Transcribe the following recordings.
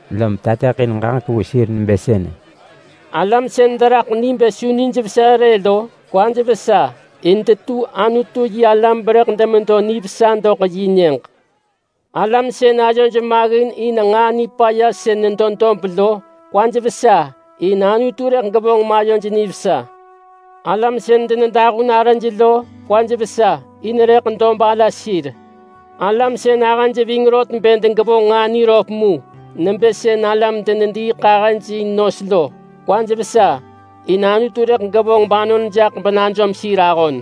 lom tateḳin ġaġek vu sir nebë sënë: “Alam sën deraḳ ni bë su nijvesa rë lo, kwaj vesa, in detu Anutu-yi-alam berëḳ demedo nivesa doḳ yi nyëġ. Alam sën ayoj maggin in nġaa nipaya sën nedo dob lo, kwaj vesa, in Anutu rëḳ gevonġ mayoj nivesa. Alam sën denedahun arëj lo, kwaj vesa, in rëḳ dob ala sir. Alam sën ahëj ving rot bë degevonġ nġaa niröp mu nebë sën alam dediiḳahëj in nos lo, kwaj vesa, in Anutu rëḳ gevonġ banon jaḳ benajom sir ahon.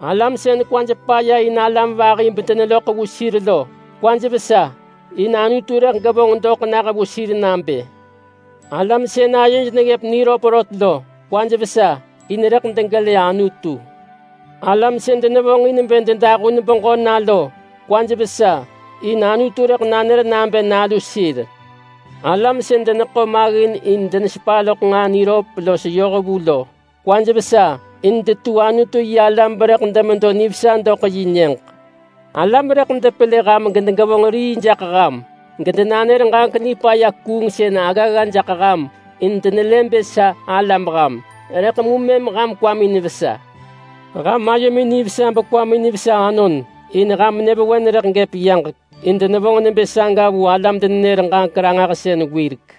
Alam sën kwaj paya in alam vahi bedeneloḳ vu sir lo, kwaj vesa, in Anutu rëḳ gevonġ doḳ nah vu sir nabë. Alam sën ayoj neggëp niröp rot lo, kwaj vesa, in rëḳ degelë Anutu. Alam sën denevonġ in bë dedahun beġö na lo, kwaj vesa, in Anutu rëḳ nanër nabë nalu sir. Alam sën deneḳo maggin in denesepa loḳ nġaa niröp los yohvu lo, kwaj vesa, in detu Anutu-yi-alam berëḳ demedo nivesa doḳ yi nyëġ. Alam rëḳ depelë ham gedegevonġ rii jaḳ ham gedenanër ġaġek nipaya kuungsën aggagga jaḳ ham in denelë bë sa alam ham, rëḳ mu mëm ham kwamin vesa. Ham ayomin nivesa bekwamin vesa anon, in ham nyëvewen rëḳ gëp yaġek, in denevonġ nebë saga vu alam-denenër-ġaġek-ranġahsën wirek.”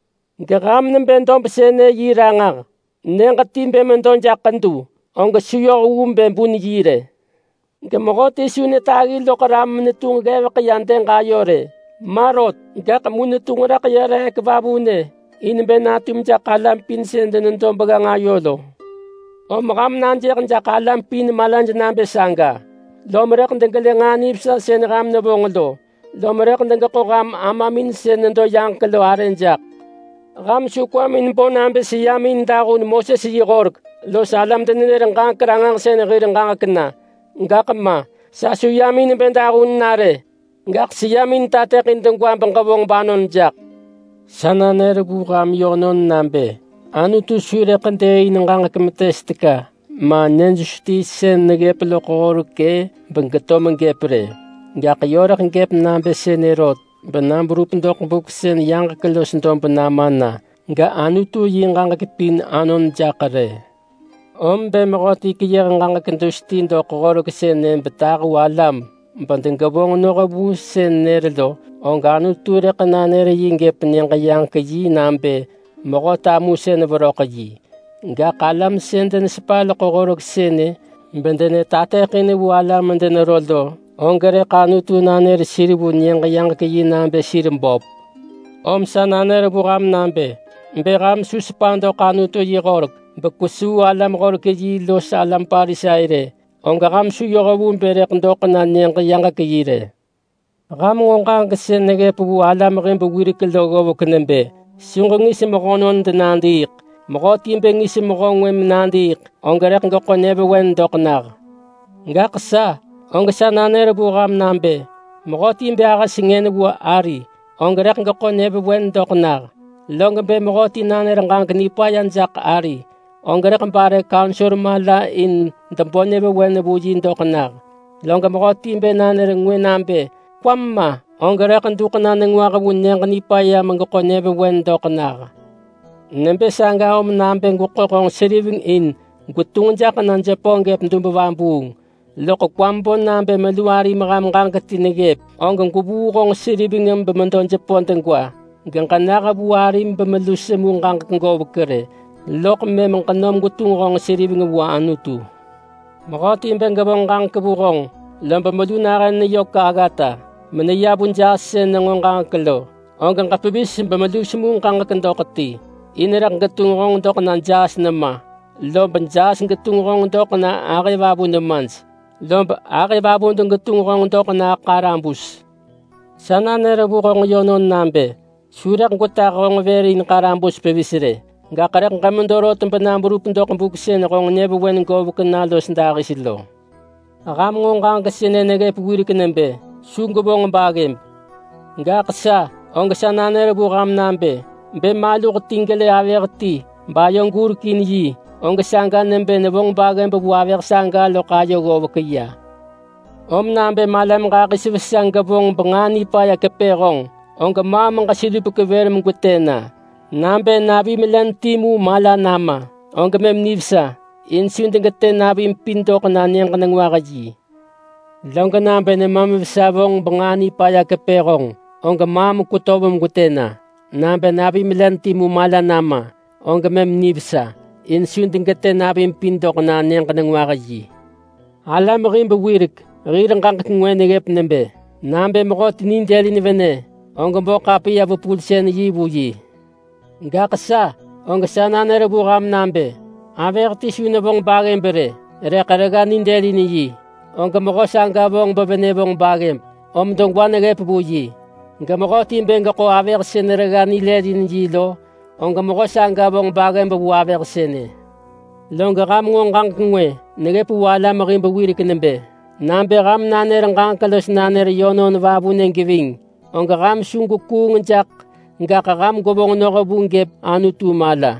Geham nebë dob sënë yi ranġah. Nyëġ ti bë medo jaḳ ḳedu, og su yoh vu bë bun yi rë. Gemehöti su netaggi loḳ ram menetunġ ggevek ya dëg ayo rë. Ma rot. Gaḳ mu netunġ raḳ nedo reek vavunë in bë natum jaḳ alam pin sën denedo begganġ ayo lo. Om ham najëh jaḳ alam pin malaj nabë saga, lob rëḳ degelë nġaa nivesa sën ham nevonġ lo, lob rëḳ degeḳo ham Amamin sën nedo yaġek lo arë jaḳ.” “Ham su kwamin bo nabë seyam in dahun Moses yi horek los alam-denenër-ġaġek-ranġahsën hir ġaġek na. Gaḳ ma. Sa su yam in bë dahun na rë, gaḳ seyam in bë tateḳin degwa beġevonġ banon jaḳ. Sa nanër vu ham yönon nabë Anutu su rëḳ dëëin ġaġek metes teka, ma nyë dus ti sën neggëp loḳ horek-ë, begeto megëp rë. Gaḳ yö rëḳ gëp nabë sënë rot, bena berup doḳ buk sën yaġek los dob nama na, gAnutu yi ġaġek pin anon jaḳ rë. Om bë mehöti keyëh ġaġek dus ti doḳ horek sënë betahu alam bedegevonġ noh vu sën nër lo, og Anutu rëḳ nanër yi gëp Nyëġ-yaġek-yi nabë mehö tamusën veröḳ-yi. Gaḳ alam sën denesepa loḳ horek sënë bedenetateḳin vu alam medenero lo, og rëḳ Anutu nanër sir vu Nyëġ-yaġek-yi nabë sir böp. Om sa nanër vu ham nabë: Bë ham su sepa doḳ Anutu yi horek bekwesuu alam-horek-yi los alam Parisai rë, og ham su yoh vu bë rëḳ doḳ na Nyëġ-yaġek-yi rë.” “Ham nġo ġaġek sën neggëp vu alam hib wirek lo ggovek nebë, ‘Su ġengis mehönon denadiiḳ’. Mehöti bë ngis mehö ngwë menadiiḳ, og rëḳ geḳo nyëvewen doḳ nah. Gaḳ sa, og sa nanër vu ham nabë: Mehöti bë ahë sengën vu ari, og rëḳ geḳo nyëvewen doḳ nah. Log bë mehöti nanër ġaġek nipaya jaḳ ari, og rëḳ bare kaunsor mala in debo nyëvewen vu yi doḳ nah. Log mehöti bë nanër ngwë nabë, ‘Kwam ma!’ og rëḳ duḳ na nengwah vu Nyëġ-nipaya megeḳo nyëvewen doḳ nah. Nebë saga lob bë gweḳo honġ seriveng in gwetunġ jaḳ na jepö gëp dub vabuung, loḳ kwam bo nabë melu arim ham ġaġek ti neggëp, og gwevuu honġ seriveng bemedo jepö degwa, geġena vu arim bemelu semu ġaġek govek rë, loḳ mëm ġenom gwetunġ honġ seriveng vu Anutu. Mehöti bë gevonġ ġaġek vu honġ, lob melu nahën neyök aggata, meneya vu jaas sën nenġo ġaġek lo, og ġepevis bemelu semu ġaġek doḳ ti. In rëḳ getunġ honġ doḳ na jaas nema, lob jaas getunġ honġ doḳ na ahëvavu nemaj, lob ahëvavu degetunġ honġ doḳ na ḳarabus. Sa nanër vu honġ yönon nabë su rëḳ gwetah honġ vër in ḳarabus pevis rë, gaḳ rëḳ ġemedo rot bena berup doḳ buk sën honġ nyëvewen govek na los dahis lo.” “Ham nġo ġaġek sënë neggëp wirek nebë, ‘Su gwevonġ baggëb’. Gaḳ sa, og sa nanër vu ham nabë: Bë maluh ti gelë avëh ti bayo gurekin yi, og saga nebë nevonġ baggëb vu avëh saga loḳ ayo ggovek ya. Om nabë malam ġahis vesa gevonġ benġaa nipaya kepë honġ, og maam ġeselupek vër megwetë na. Nabë navim len timu mala nama, og mëm nivesa, in su degetë navim pin doḳ na Nyëġ-nengwah-yi. Log nabë nemam vesa vonġ benġaa nipaya kepë honġ, og maam kwetöv megwetë na. Nabë navim len timu mala nama, og mëm nivesa, in su degetë navim pin doḳ na Nyëġ-nengwah-yi.” “Alam hib wirek hir ġaġek ngwë neggëp nebë, ‘Nabë mehöti nidëlin venë, og bo ḳapiya-vepulsën-yi vu yi’. Gaḳ sa, og sa nanër vu ham nabë: Avëh ti su nevonġ baggëb rë rëḳ regga nidëlin yi, og mehö saga vonġ bevenë vonġ baggëb, om degwa neggëp vu yi. Gemehöti bë geḳo avëh sën regga nilëlin yi lo, og mehö saga vonġ baggëb vu avëh sënë.” “Log ham nġo ġaġek ngwë neggëp vu alam hib wirek nebë, ‘Nabë ham nanër ġaġek los nanër yönon vavunë geving, og ham su gwekuung jaḳ, gaḳ ham gwevonġ noh vu gëp Anutu mala’.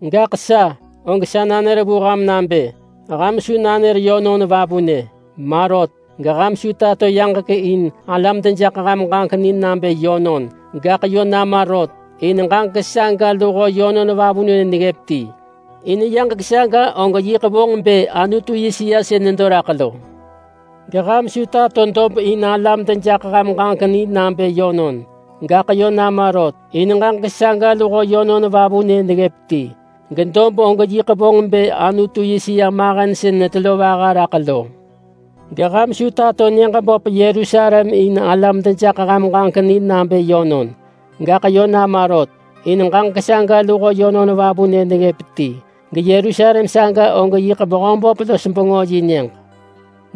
Gaḳ sa, og sa nanër vu ham nabë: Ham su nanër yönon vavunë. Ma rot. Geham su tato yaġek in alam dejaḳ ham ġaġek ni nabë yönon! Gaḳ yö nama rot, in ġaġek saga luho yönon vavunë neggëp ti. In yaġek saga og yiḳ vonġ bë Anutu yi sëa sën nedo raḳ lo. Geham su tato dob in alam dejaḳ ham ġaġek ni nabë yönon, gaḳ yö nama rot, in ġaġek saga luho yönon vavunë neggëp ti. Gedob og yiḳ vonġ bë Anutu yi sëa mahen sën nebë vaha raḳ lo. Geham su tato nyëġ böp Yerusalem in alam dejaḳ ham ġaġek ni nabë yönon! Gaḳ yö nama rot, in ġaġek saga luho yönon vavunë neggëp ti. GeYerusalem saga og yiḳ Mehöböp-los-bengö yi nyëġ.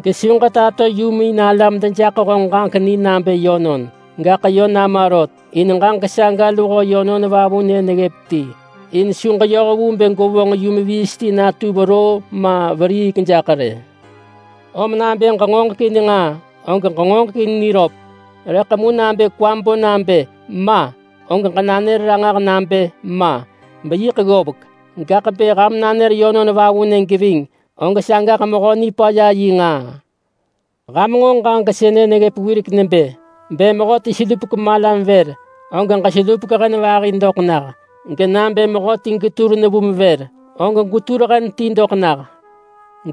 Gesu ġetato yum in alam dejaḳ honġ ġaġek ni nabë yönon, gaḳ yö nama rot, in ġaġek saga luho yönon vavunë neggëp ti. In su ġeyoh vu bë gwevonġ yum viis ti natu veroo ma veriik jaḳ rë. Om nabë ġengoġekin nġaa, og ġengoġekin niröp, rëḳ mu nabë kwam bo nabë ‘Ma!’, og ġenanër ranġah nabë ‘Ma!’ Beyiḳ ggovek. Gaḳ bë ham nanër yönon vavunë geving, og sagaḳ Mehö Nipaya yi nġaa.” “Ham nġo ġaġek sënë neggëp wirek nebë, ‘Bë mehöti selupek malam vër, og ġeselupek hen vahi doḳ nah, genabë mehöti getur nevum vër, og gwetur hen ti doḳ nah’.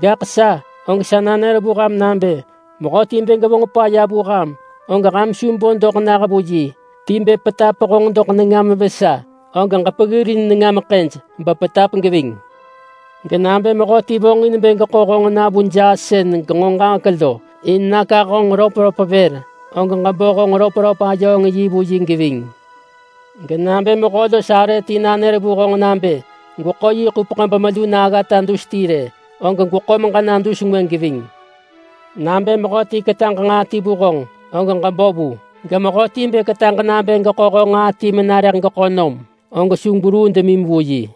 Gaḳ sa, og sa nanër vu ham nabë: Mehöti bë gevonġ paya vu ham, og ham su bo doḳ nah vu yi. Ti bë petap honġ doḳ nengam vesa, og ġepeggirin nengam ḳëj bepetap geving. Genabë mehöti vonġin bë geḳo honġ na vu jaas sën genġo ġaġek lo, in nakah honġ röpröp vër, og ġebo honġ röpröp-ayööng-yi vu yi geving. Genabë mehö los arë ti nanër vu honġ nabë gweḳo yi ḳupeḳ bemelu na aggata dus ti rë, og gweḳo meġena dus ngwë geving. Nabë mehöti ketaġ nġaa ti vu honġ, og ġebo vu. Gemehöti bë ketaġ nabë geḳo honġ nġaa ti mena rëḳ geḳo nom, og su gweruu demim vu yi.”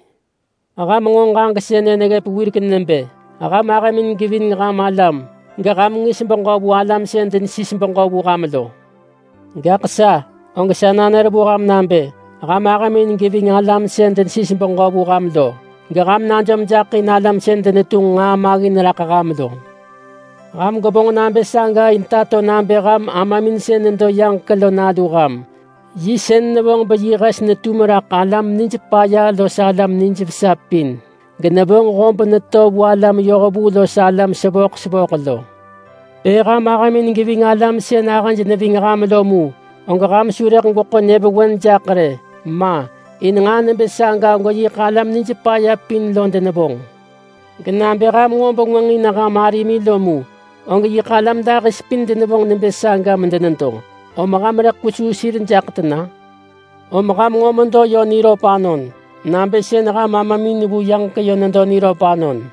“Ham nġo ġaġek sënë neggëp wirek nebë, ‘Ham ahëmin geving ham alam, geham ngis beġö vu alam sën denesis beġö vu ham lo’. Gaḳ sa, og sa nanër vu ham nabë: Ham ahëmin geving alam sën denesis beġö vu ham lo, geham najom jaḳ in alam sën denedeġinengin nġaa maggin raḳ ham lo. Ham gwevonġ nabë saga in tato nabë ham Amamin sën nedo yaġek lo nalu ham. Yi sën nevonġ beyi hes netum raḳ alam nij paya los alam nijvesa pin, genevonġ hob neto vu alam yohvu los alam sevöḳ sevöḳ lo. Bë ham ahëmin geving alam sën ahëj neving ham lo mu, og ham su rëḳ gweḳo nyëvewen jaḳ rë. Ma! In nġaa nebë saga og yiḳ alam nij paya pin lo denevonġ. Genabë ham nġo bengwënġ in ham arimin lo mu, og yiḳ alam dahis pin denevonġ nebë saga medenedo, om ham vonġ nġaa böp tena kesuu sir-a? Om ham nġo medo yö niröp anon, nabë sën ham Amamin vu yaġek yö nedo niröp anon.”